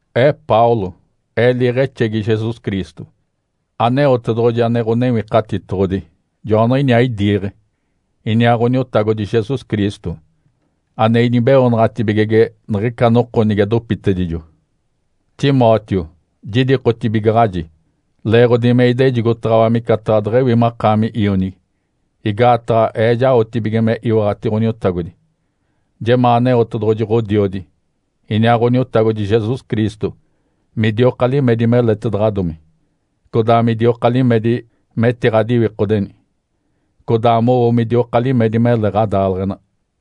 Ee Paulo, ee liiɡ̶exegi Jesus Cristo. Aneotedoɡ̶oji ane Ǥonewikatitoɡ̶odi, joaniɡ̶iniaa idiiɡ̶e, iniaa Ǥoniotagodi Jesus Cristo, ane inibeoonaɡ̶atibigege niɡ̶ica noko nige dopitedijo. Timóteo, jidikotibigaɡ̶aji leeɡ̶odi me idejigotaɡ̶awa micataɡ̶a deɡ̶ewi makaami ionigi, igaataɡ̶a ee jaotibige me iwaɡ̶ati Ǥoniotagodi. Jemaa Aneotedoɡ̶oji Ǥodiodi, iniaa Ǥoniotagodi Jesus Cristo midioka limedi meletaɡ̶adomi, codaa midioka limedi metiɡ̶adiwikodeni, codaa mowo midioka limedi mele ɡ̶adaaleɡ̶ena.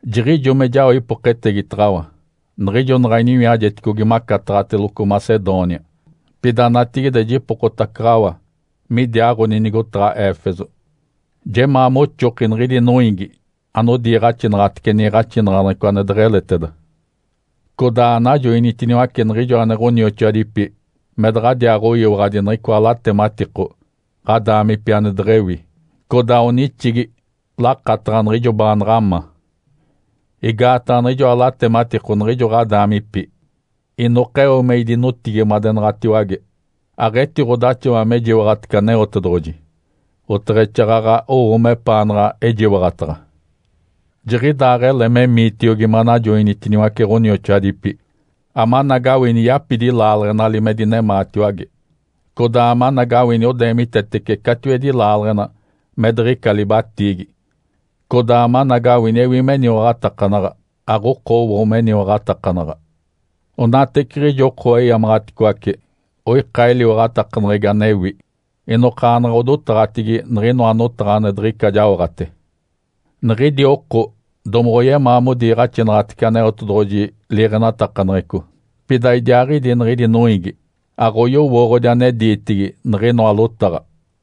Jiɡ̶ijo me jao ipoketegitaɡ̶awa niɡ̶ijo naɡ̶a iniwiajeticogi macataɡ̶ateloco Macedônia, pida natigide jipokotacaɡ̶awa midiaaɡ̶oni nigotaɡ̶a Éfeso. Jemaa moxoki niɡ̶idi noiigi anodiiɡ̶axinaɡ̶atece niiɡ̶axinaɡ̶aneɡ̶eco ane deɡ̶eleteda. Codaa anajoinitiniwace niɡ̶ijo ane ɡ̶onioxoadipi me daɡ̶adiaaɡ̶oyiwaɡ̶adi niɡ̶icoa latematiko ɡ̶adaamipi ane deɡ̶ewi, codaa onixigi lakataɡ̶a niɡ̶ijo baanaɡ̶a ma. Igaataɡ̶a niɡ̶ijoa latematiko niɡ̶ijo ɡ̶adaamipi inokeo me idinotigimadenaɡ̶atiwage. Aɡ̶etiɡ̶odaxawa me jiwaɡ̶atece Aneotedoɡ̶oji oteɡ̶exaaɡ̶aɡ̶a owo mepaanaɡ̶a ejiwaɡ̶ataɡ̶a. Jiɡ̶idaaɡ̶ele memiitiogi manajoinitiniwace ɡ̶onioxoadipi, amanagawini yapidi laaleɡ̶enali me dinemaatiwage, codaa amanagawini odeemitetece catiwedi laaleɡ̶ena me diɡ̶ica libatiigi, codaa amanagawini ewi meniwaɡ̶atakanaɡ̶a, aɡ̶okowo meniwaɡ̶atakanaɡ̶a. Onateciɡ̶ijo oko eyamaɡ̶aticoace, oika eliwaɡ̶atakaneɡ̶egi anewi, inokaanaɡ̶a odotaɡ̶atigi niɡ̶inoa notaɡ̶a ane diɡ̶ica jaoɡ̶ate. Niɡ̶idi oko domoɡ̶oyemaa modiiɡ̶axinaɡ̶atece Aneotedoɡ̶oji liiɡ̶enatakaneɡ̶eco, pida idiaaɡ̶idi niɡ̶idi noiigi aɡ̶oyowooɡ̶odi ane diitigi niɡ̶inoa lotaɡ̶a.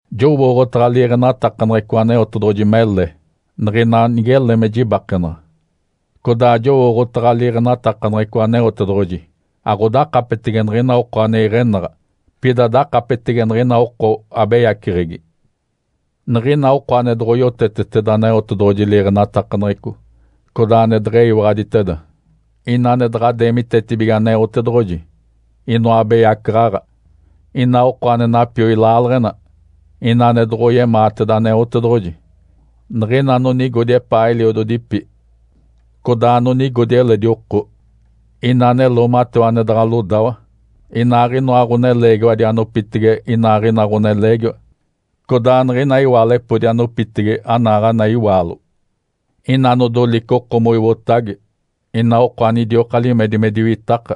Jowooɡ̶otaɡ̶a liiɡ̶enatakaneɡ̶eco Aneotedoɡ̶oji mele, niɡ̶ina nigele me jibakenaɡ̶a. Codaa jowooɡ̶otaɡ̶a liiɡ̶enatakaneɡ̶eco Aneotedoɡ̶oji aɡ̶odakapetege niɡ̶ina oko ane iɡ̶enaɡ̶a, pida dakapetege niɡ̶ina oko abeyaceɡ̶egi; niɡ̶ina oko ane daɡ̶a yoteteteda Aneotedoɡ̶oji liiɡ̶enatakaneɡ̶eco, codaa ane deɡ̶eyiwaɡ̶aditeda, ina ane daɡ̶a deemitetibige Aneotedoɡ̶oji, inoa abeyacaɡ̶aɡ̶a, ina oko ane napioi laaleɡ̶ena, ina ane doɡ̶oyemaateda Aneotedoɡ̶oji; niɡ̶ina anonigodi epaa eliododipi, codaa anonigodi eledi oko; ina ane loomatewa ane daɡ̶a lodawa, inaaɡ̶inoa ɡ̶oneleegiwadi anopitege inaaɡ̶ina ɡ̶oneleegiwa, codaa niɡ̶ina iwaalepodi anopitege anaaɡ̶ana iwaalo; ina anodolice oko moiotage; ina oko anidioka limedi me diwitaka;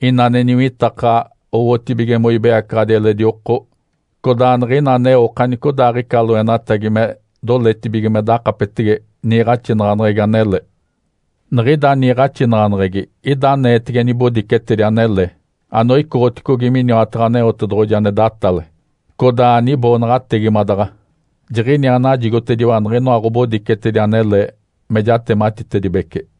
ina ane niwitakaɡ̶a owotibige moibeyacaɡ̶adi eledi oko; codaa niɡ̶ina aneo okanicodaaɡ̶ica loenatagi me doletibige me dakapetege niiɡ̶axinaɡ̶aneɡ̶egi anele. Niɡ̶ida niiɡ̶axinaɡ̶aneɡ̶egi ida aneetege nibodicetedi anele anoicoɡ̶oticogi miniwataɡ̶a Aneotedoɡ̶oji ane datale, codaa aniboonaɡ̶ategimadaɡ̶a. Jiɡ̶iniaa najigotediwa niɡ̶inoa ɡ̶obodicetedi anele me jatematitedibece.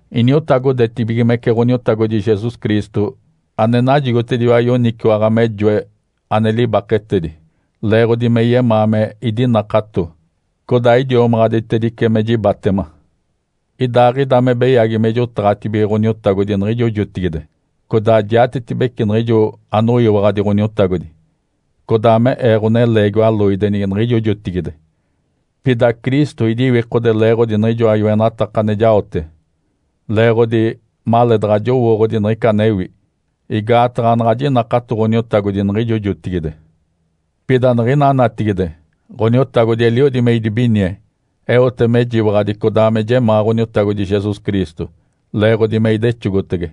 Iniotagodetibigimece Ǥoniotagodi Jesus Cristo, ane najigotediwa yoniciwaɡ̶a me joe ane libaketedi, leeɡ̶odi me yemaa me idinakato, codaa idiomaɡ̶aditedice me jibatema. Idaaɡ̶ida me beyagi me jotaɡ̶atibige Ǥoniotagodi niɡ̶ijo jotigide, codaa jiatetibece niɡ̶ijo anoyiwaɡ̶adi Ǥoniotagodi, codaa me ee ɡ̶oneleegiwa loidenigi niɡ̶ijo jotigide. Pida Cristo idiwikode leeɡ̶odi niɡ̶ijoa yoenataka ane jaote, leeɡ̶odi maleedaɡ̶a jowooɡ̶odi niɡ̶ica anewi, igaataɡ̶a anaɡ̶a jinakato Ǥoniotagodi niɡ̶ijo jotigide. Pida niɡ̶ina natigide Ǥoniotagodi eliodi me idibinie, eote mejiwaɡ̶adi codaa me jemaa Ǥoniotagodi Jesus Cristo leeɡ̶odi me idexogotege.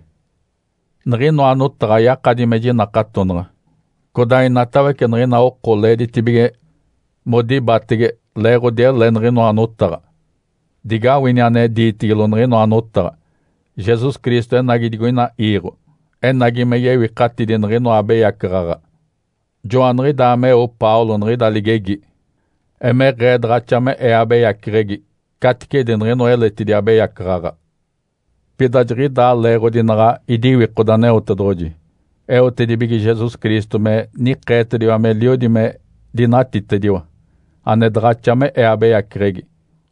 Niɡ̶inoa notaɡ̶a yakadi me jinakatonaɡ̶a, codaa inatawece niɡ̶ina oko leeditibige modibatege leeɡ̶odi ele niɡ̶inoa notaɡ̶a. Digawini ane diitigilo niɡ̶inoa notaɡ̶a, “Jesus Cristo enagi digoina iiɡ̶o, enagi me yewikatidi niɡ̶inoa abeyacaɡ̶aɡ̶a.” (Joaniɡ̶idaa meo Paulo niɡ̶ida ligegi). Emeɡ̶ee daɡ̶axa me ee abeyaceɡ̶egi caticedi niɡ̶inoa eletidi abeyacaɡ̶aɡ̶a. Pida jiɡ̶idaa leeɡ̶odi naɡ̶a idiwikode Aneotedoɡ̶oji, eotedibige Jesus Cristo me nikeetediwa meliodi me dinatitediwa, ane daɡ̶axa me ee abeyaceɡ̶egi.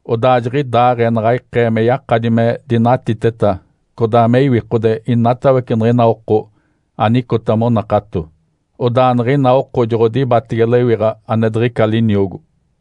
Odaa jiɡ̶idaaɡ̶ee naɡ̶a ikee me yakadi me dinatiteta codaa me iwikode inatawece niɡ̶ina oko anicota monakato, odaa niɡ̶ina oko joɡ̶odibatege lewiɡ̶a ane diɡ̶ica liniogo.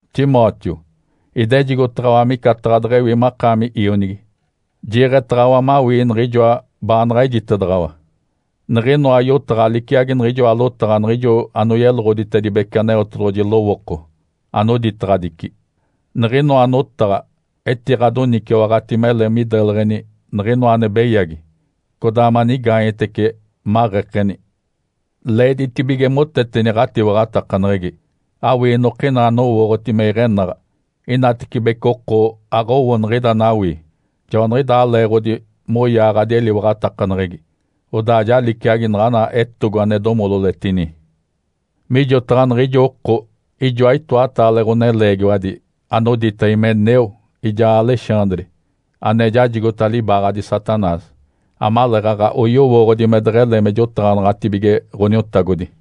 Timóteo, idejigotaɡ̶awa micataɡ̶a deɡ̶ewi makaami ionigi. Jiiɡ̶etaɡ̶awa mawii niɡ̶ijoa baanaɡ̶a ejitedaɡ̶awa. Niɡ̶inoa yotaɡ̶a liciagi niɡ̶ijoa lotaɡ̶a niɡ̶ijo anoyeloɡ̶oditedibece Aneotedoɡ̶oji lowooko anoditaɡ̶adici. Niɡ̶inoa notaɡ̶a etiɡ̶adoniciwaɡ̶ati mele mideleɡ̶eni niɡ̶inoa ane beyagi codaa manigaanyetece, maɡ̶ekeni. Leeditibige moteteni ɡ̶atiwaɡ̶atakaneɡ̶egi, awii inokina anowooɡ̶oti me iɡ̶enaɡ̶a. Inatibece oko aɡ̶owo niɡ̶ida anawii, joaniɡ̶idaa leeɡ̶odi moyaaɡ̶adi eliwaɡ̶atakaneɡ̶egi, odaa ja liciagi naɡ̶ana etogo ane domololetini. Mijotaɡ̶a niɡ̶ijo oko, ijoa itoataale ɡ̶oneleegiwadi anodita Himeneu, ijaa Alexandre, ane jajigota libaaɡ̶adi Satanás, amaleeɡ̶aɡ̶a oyowooɡ̶odi me deɡ̶ele me jotaɡ̶anaɡ̶atibige Ǥoniotagodi.